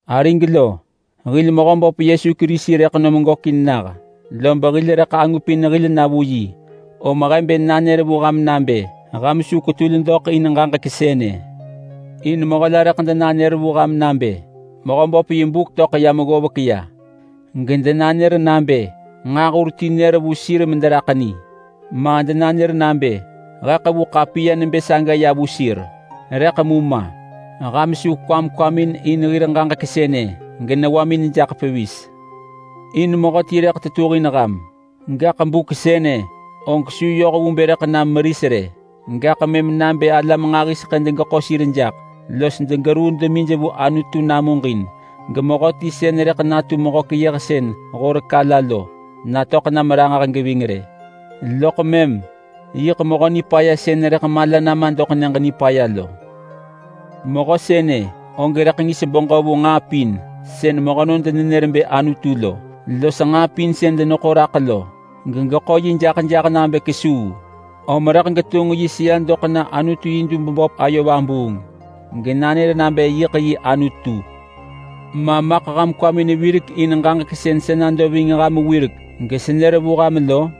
Arig lo, hil Mehöböp Yesu Kerisi rëḳ nom gökin nah, lob hil rëḳ angupin hil na vu yi, om he bë nanër vu ham nabë ham su kwetul doḳ in ġaġek sënë. In mehö la rëḳ denanër vu ham nabë Mehöböp yi buk töḳ yam ggovek ya gedenanër nabë nġaahur ti nër vu sir mederaḳ ni. Ma denanër nabë he ḳevu ḳapiya nebë saga ya vu sir. Rëḳ ma geham su kwam kwamin in hir ġaġek sënë genewamin jaḳ pevis. In mehöti rëḳ tetuhin ham, gaḳ buk sënë og su yoh vu bë rëḳ nam meris rë. Gaḳ mëm nabë alam nġahiseḳë degeḳo sir jaḳ los degeruu demij vu Anutu namuġin, gemehöti sën rëḳ natu Mehö-keyëhsën-horek-ala lo natöḳ nam ranġah geving rë, loḳ mëm. Yiḳ Mehö Nipaya sën rëḳ mala nama doḳ Nyëġ Nipaya lo. Mehö sënë og rëḳ ngis beġö vu nġaa pin sën mehönon denenër bë anutu lo los nġaa pin sën deneḳo raḳ lo, gegeḳo yi jaḳ jaḳ nabë kesuu. Om rëḳ getunġ yi sëa doḳ na Anutu yi dub böp ayo vabuung genanër nabë yiḳ yi Anutu. Ma ham kwamin virek in ġaġek sën sa nado ving ham wirek gesenër vu ham lo?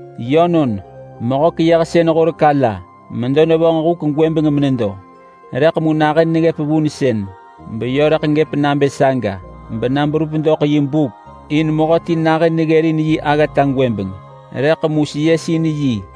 Yönon, Mehö-keyëhsën-horek-ala medo nevonġ huk gwëbeng menedo, rëḳ mu nahën neggëp vunsën beyö rëḳ gëp nabë saga bena berup doḳ yi buk. In Mehö ti nahën neggërin yi aggata gwëbeng, rëḳ mu getahin bër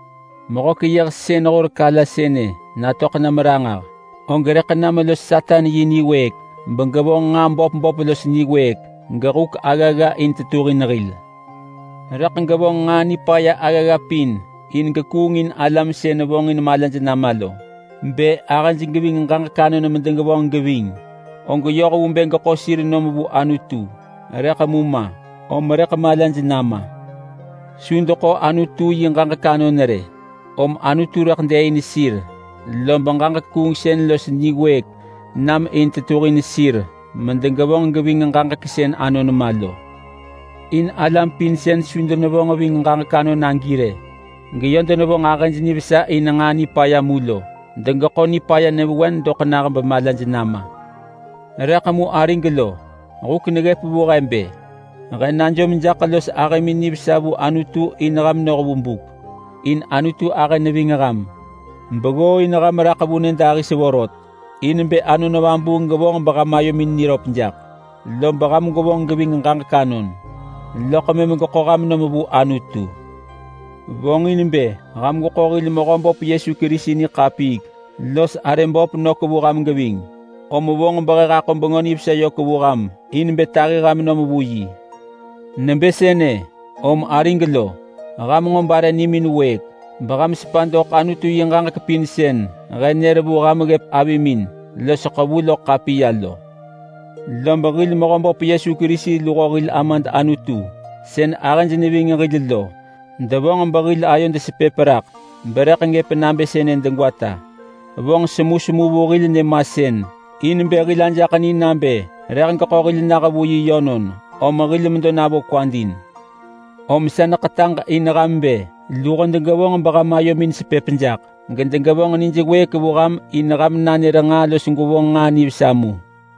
Mehö-keyëhsën-horek-ala sënë natöḳ nam ranġah, og rëḳ nam los Satan yi niwëëk begevonġ nġaa böp böp los niwëëk, gehuk aggagga in tetuhin hil. Rëḳ gevonġ nġaa nipaya aggagga pin in gekuungin alam sën vonġin malaj nama lo. Bë ahëj geving ġaġek anon medegevonġ geving, og yoh vu bë geḳo sir nom vu Anutu, rëḳ mu ma om rëḳ malaj nama. Su deḳo Anutu yi ġaġek anon rë, om Anutu rëḳ dëëin sir lob ġaġek kuungsën los niwëëk nam in tetuhin sir medegevonġ geving ġaġek sën anon ma lo. In alam pin sën su denevonġ ving ġaġek anon agi rë geyö denevonġ ahëj nivesa in nġaa nipaya mu lo degeḳo nipaya nyëvewen doḳ nah bemalaj nama. Rëḳ mu arig lo, huk neggëp vu he bë he najom jaḳ los ahëmin nivesa vu Anutu in ham noh vu buk. In Anutu ahë neving ham beggooin ham raḳ vu nyëdahis vorot in bë Anon Vabuung gevonġ beham ayomin niröp jaḳ. Lob ham gwevonġ geving ġaġek anon, loḳ mëm geḳo ham nom vu Anutu. Vonġin bë ham gweḳo hil Mehöböp Yesu Kerisi niḳapiik los arë böp nök vu ham geving, om vonġ behe haḳo Bengö Nivesa yök vu ham in bë tahi ham nom vu yi. Nebë sënë, om arig lo, ham nġo bare nimin wëëk, beham sepa doḳ Anutu yi ġaġek pin sën he nër vu ham ggëp avimin los ḳevu loḳ ḳapiya lo. Lob hil Mehöböp Yesu Kerisi luho hil Amad Anutu sën ahëj neving hil lo devonġ behil ayod sepëp raḳ berëḳ gëp nabë sënë degwata. Vonġ semusemu vu hil nyëmasën in bë hil ajaḳ ni nabë rëḳ geḳo hil nah vu yi yönon, om hil medo navo kwad in. Om sa neḳetaġ in ham bë luho degevonġ beham ayomin sepëp jaḳ gedegevonġ nij wëëk vu ham in ham nanër nġaa los gwevonġ nġaa nivesa mu.